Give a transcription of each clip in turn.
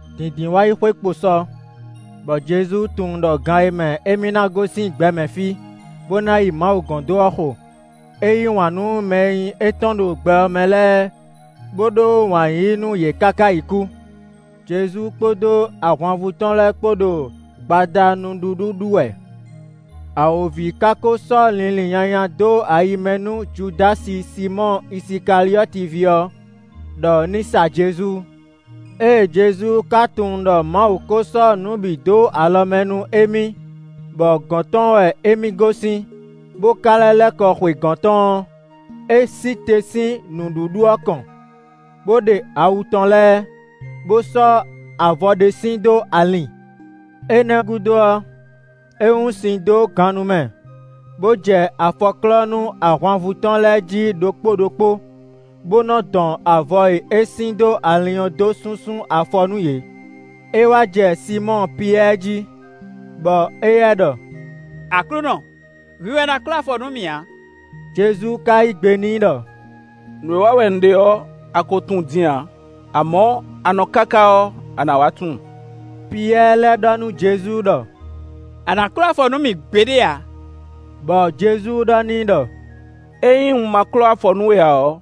Dǐndínwáyixwe kpo sɔ, bɔ Jezu tunwun ɖɔ gan e mɛ émí ná gosín gbɛ mɛ fí, bó ná yi Mawu gɔ́n dó ɔ́ xo. É yí wǎn nú mɛ e nyí étɔn ɖo gbɛ ɔ́ mɛ lɛ́ɛ bó ɖó wǎn yíyí nú yě káká yi kú. Jezu kpódó ahwanvú tɔn lɛ́ɛ kpó ɖo gbada nǔɖuɖu ɖu wɛ. Awǒvi ka ko sɔ́ linlin nyanya dó ayi mɛ nú Judási Sinmɔ́ɔ Isikaliɔ́ti ví ɔ́, ɖɔ ní sa Jezu. Ée Jezu ka tunwun ɖɔ Mawu ko sɔ́ nǔ bǐ dó alɔ mɛ nú émí, bɔ gɔ̌n tɔn wɛ e mi gosín, bó ka lɛ́ lɛ́ kɔ xwe gɔ̌n tɔn ɔ́, é sí te sín nǔɖuɖu ɔ́ kɔn, bó ɖe awu tɔn lɛ́ɛ, bó sɔ́ avɔ ɖé sin dó alin. Énɛ́ gúdo ɔ́, é wún sin dó gannú mɛ, bó jɛ afɔ klɔ́ nú ahwanvú tɔn lɛ́ɛ jí ɖokpó ɖokpó, bó nɔ́ dɔn avɔ e é sin dó alin ɔ́ dó súnsún afɔ nú yě. É wá jɛ Sinmɔ́ɔ Piyɛ́ɛ jí, bɔ éyɛ́ ɖɔ: “Aklúnɔ, hwi wɛ ná klɔ́ afɔ nú mì a?” Jezu ka yí gbe n'i ɖɔ: “Nǔ e wa wɛ un ɖe ɔ́, a ko tunwun din ǎ; amɔ̌, a nɔ káká ɔ́, a nǎ wá tunwun.” Piyɛ́ɛ lɛ́ ɖɔ nú Jezu ɖɔ: “A nǎ klɔ́ afɔ nú mì gbeɖé ǎ!” Bɔ Jezu ɖɔ n'i ɖɔ: “Ényí un ma klɔ́ afɔ nú we ǎ ɔ́,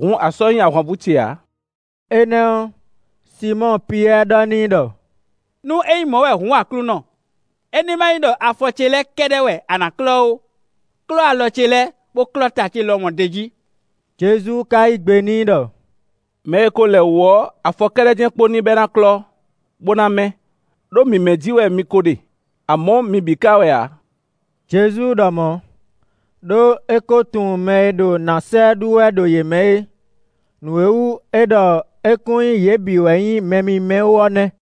hǔn a sɔ́ nyí ahwanvú ce ǎ.” Énɛ́ ɔ́, Sinmɔ́ɔ Piyɛ́ɛ ɖɔ n'i ɖɔ: “Nú ényí mɔ wɛ hǔn Aklúnɔ, é ní ma nyí ɖɔ afɔ ce lɛ́ɛ kɛ́ɖɛ́ wɛ a nǎ klɔ́ ó; klɔ́ alɔ ce lɛ́ɛ, bó klɔ́ ta ce lɔmɔ̌ d'é jí.” Jezu ka yí gbe n'i ɖɔ: “Mɛ e ko lɛ wǔ ɔ́, afɔ kɛ́ɖɛ́ jɛ́n kpo n'i bɔ é ná klɔ́, bó ná mɛ́; ɖó mǐmɛ́ jí wɛ mi ko ɖe; amɔ̌ mi bǐ ka wɛ ǎ.” Jezu ɖɔ mɔ̌, ɖó é ko tunwun mɛ e ɖo nǎ sa ɛ ɖu wɛ ɖo yě mɛ é; nǔ e wú é ɖɔ é kún nyí yě bǐ wɛ nyí mɛ mímɛ́ ó ɔ́ nɛ́.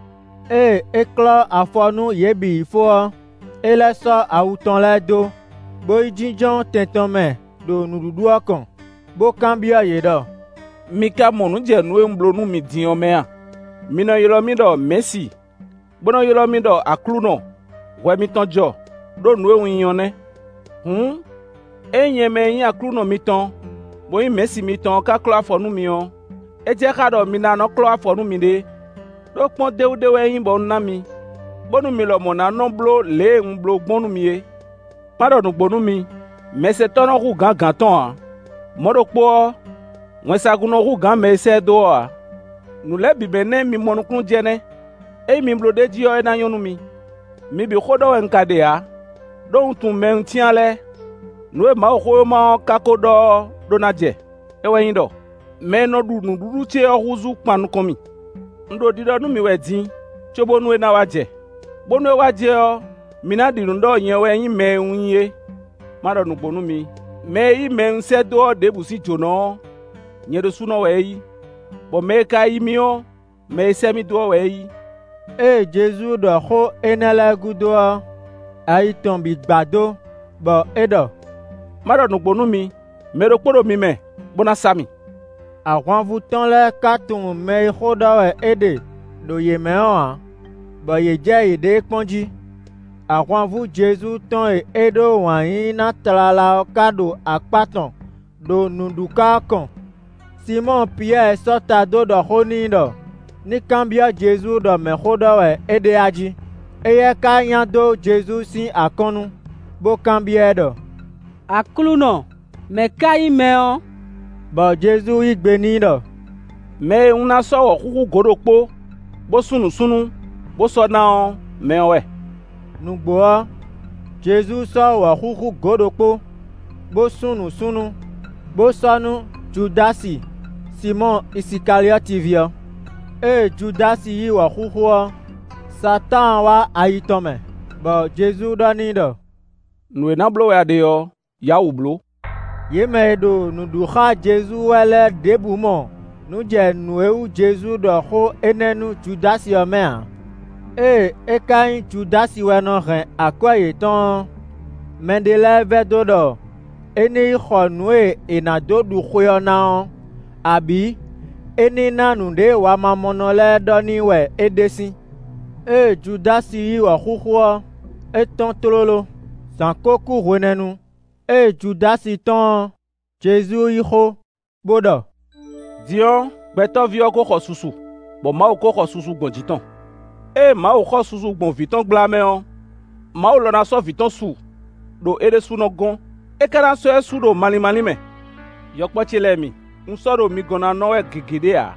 Ée é klɔ́ afɔ nú yě bǐ yi fó ɔ́, é lɛ́ sɔ́ awu tɔn lɛ́ɛ dó, bó yi jínjɔ́n tɛn tɔn mɛ ɖo nǔɖuɖu ɔ́ kɔn, bó kanbyɔ́ yě ɖɔ: “Mi ka mɔ nǔ jɛ nǔ e un bló nú mi din ɔ́ mɛ a? Mi nɔ ylɔ́ mì ɖɔ ‘Mɛ̌si’, bó nɔ́ ylɔ́ mì ɖɔ ‘Aklúnɔ’; hwɛ mitɔn jɔ, ɖó nǔ e un nyí ɔ́ nɛ́. Hǔn, ényí nyɛ mɛ e nyí Aklúnɔ mitɔn, bó nyí Mɛ̌si mitɔn ɔ́ ka klɔ́ afɔ nú mi ɔ́, é jɛ xá ɖɔ mi ná nɔ́ klɔ́ afɔ nú miɖée. Đó kpɔ́ndéwú ɖé wɛ é nyí, bɔ un ná mi, bónú mi lɔmɔ̌ ná nɔ́ bló lě e un bló gbɔn nú mi é. Má ɖɔ nǔgbó nú mi: mɛsɛntɔ́ nɔ hú gǎn gǎn tɔn ǎ; mɔ̌ ɖokpó ɔ́, wɛnsagun nɔ hú gǎn mɛ e sɛ́ ɛ dó ɔ́ ǎ. Nǔ lɛ́ɛ bǐ mɛ nɛ́ mi mɔ nukúnnú jɛ nɛ́; ényí mi bló ɖ'é jí ɔ́, é ná nyɔ́ nú mi. Mi bǐ xó ɖɔ wɛ un ka ɖe ǎ, ɖó un tunwun mɛ e un cyán lɛ́ɛ; nǔ e Mawuxówéma ɔ́ ka ko ɖɔ ɔ́ ɖó ná jɛ. É wɛ nyí ɖɔ: ‘Mɛ e nɔ ɖu nǔɖuɖu ce ɔ́ húzú kpan nukɔn mì.’ Un ɖo ɖiɖɔ nú mi wɛ din, cóbónú é ná wá jɛ; bónú é wá jɛ ɔ́, mi na ɖi nǔ ɖɔ nyɛ wɛ nyí mɛ e un nyí é. Má ɖɔ nǔgbó nú mi: mɛ e yí mɛ e un sɛ́ dó ɔ́ ɖěbǔ sín jǒnɔ ɔ́, nyɛ ɖésúnɔ wɛ é yí, bɔ mɛ e ka yí mì ɔ́, mɛ e sɛ́ mì dó ɔ́ wɛ é yí.” Ée Jezu ɖɔ xó énɛ́ lɛ́ɛ gúdo ɔ́, ayi tɔn bǐ gbadó, bɔ é ɖɔ: “Má ɖɔ nǔgbó nú mi: mɛ ɖokpó ɖo mi mɛ, bó ná sa mì.” Ahwanvú tɔn lɛ́ɛ ka tunwun mɛ e xó ɖɔ wɛ é ɖe ɖo yě mɛ ɔ́ ǎ, bɔ yě jɛ yěɖée kpɔ́n jí. Ahwanvú Jezu tɔn e é ɖó wǎn yíyí ná tlala ɔ́ ka ɖo akpá tɔn ɖo nǔɖuká ɔ́ kɔn. Sinmɔ́ɔ Piyɛ́ɛ sɔ́ ta dó ɖɔ xó n'i ɖɔ ní kanbyɔ́ Jezu ɖɔ mɛ xó ɖɔ wɛ é ɖe ají. Éyɛ́ ka nya dó Jezu sín akɔ́nnu, bó kanbyɔ́ ɛ ɖɔ: “Aklúnɔ, mɛ̌ ka nyí mɛ ɔ́?” Bɔ Jezu yí gbe n'i ɖɔ: “Mɛ e un ná sɔ́ wɔ̌xúxú gǒ ɖokpó, bó sún nǔsúnnú, bó sɔ́ ná ɔ́, mɛ ɔ́ wɛ.” Nǔgbó ɔ́, Jezu sɔ́ wɔ̌xúxú gǒ ɖokpó, bó sún nǔsúnnú, bó sɔ́ nú Judási Sinmɔ́ɔ Isikaliɔ́ti ví ɔ́. Ée Judási yí wɔ̌xúxú ɔ́, Satáan wá ayi tɔn mɛ, bɔ Jezu ɖɔ n'i ɖɔ: “Nǔ e ná bló wɛ a ɖe ɔ́, yǎ wǔ bló.” Yě mɛ e ɖo nǔ ɖu xá Jezu wɛ lɛ́ɛ ɖěbǔ mɔ nǔ jɛ nǔ e wú Jezu ɖɔ xó énɛ́ nú Judási ɔ́ mɛ ǎ. Ée é ka nyí Judási wɛ nɔ hɛn akwɛ́ yětɔn ɔ́, mɛɖé lɛ́ɛ vɛdó ɖɔ é ní yi xɔ nǔ e è nǎ dó ɖu xwe ɔ́ ná ɔ́, abǐ é ní ná nǔɖé wamamɔnɔ lɛ́ɛ ɖɔ n'i wɛ é ɖe sín. Ée Judási yí wɔ̌xúxú ɔ́, é tɔ́n tlóló. Zǎn ko kú hwenɛ́nu. Ée Judási tɔ́n ɔ́, Jezu yí xó bó ɖɔ: “Din ɔ́, Gbɛtɔ́ví ɔ́ ko xɔ susu, bɔ Mawu ko xɔ susu gbɔn jǐ tɔn. Ée Mawu xɔ susu gbɔn vǐ tɔn gbla mɛ ɔ́, Mawu lɔ ná sɔ́ vǐ tɔn su ɖo é ɖésúnɔ gɔ́n; é ka ná sɔ́ ɛ su ɖo malín málín mɛ. Yɔkpɔ́ ce lɛ́ɛ mi, un sɔ́ ɖo mi gɔ́n ná nɔ wɛ gěgé ɖé ǎ.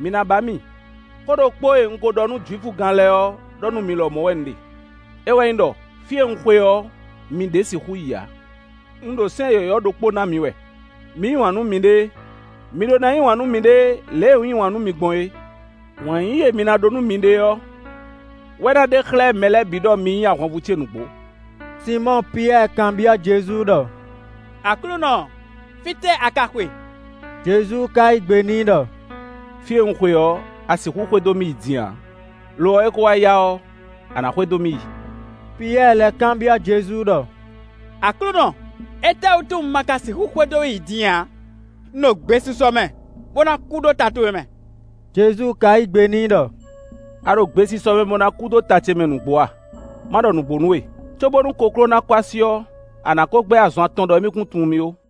Mi ná ba mì. Xó ɖokpó e un ko ɖɔ nú Jwifugán lɛ́ɛ ɔ́ ɖɔ nú mi lɔmɔ̌ wɛ un ɖe. É wɛ nyí ɖɔ: ‘Fí e un xwe ɔ́, mi ɖě sixú yi ǎ.’ Un ɖo sɛ́n yɔ̌yɔ́ ɖokpó ná mi wɛ: mi yí wǎn nú miɖée. Mi ɖó ná yí wǎn nú miɖée lě e un yí wǎn nú mi gbɔn é. Wǎn yíyí e mi ná ɖó nú miɖée ɔ́, wɛ ná ɖe xlɛ́ mɛ lɛ́ɛ bǐ ɖɔ mi nyí ahwanvú ce nǔgbó.” Sinmɔ́ɔ Piyɛ́ɛ kanbyɔ́ Jezu ɖɔ: “Aklúnɔ, fítɛ́ a ka xwe?” Jezu ka yí gbe n'i ɖɔ: “Fí e un xwe ɔ́, a sixú xwedó mì yi din ǎ; lo ɔ́, é ko wá yá ɔ́, a nǎ xwedó mì yi.” Piyɛ́ɛ lɛ́ kanbyɔ́ Jezu ɖɔ: “Aklúnɔ, étɛ́wútu un ma ka sixú xwedó we yi din ǎ? Un ɖo gbesisɔ mɛ, bó ná kú ɖó ta towe mɛ.” Jezu ka yí gbe n'i ɖɔ: “A ɖo gbesisɔ mɛ bó ná kú ɖó ta ce mɛ nǔgbó a? Má ɖɔ nǔgbó nú we: cóbónú kokló ná kɔ́ así ɔ́, a nǎ ko gbɛ́ azɔn atɔn ɖɔ émí kún tunwun mì ó.”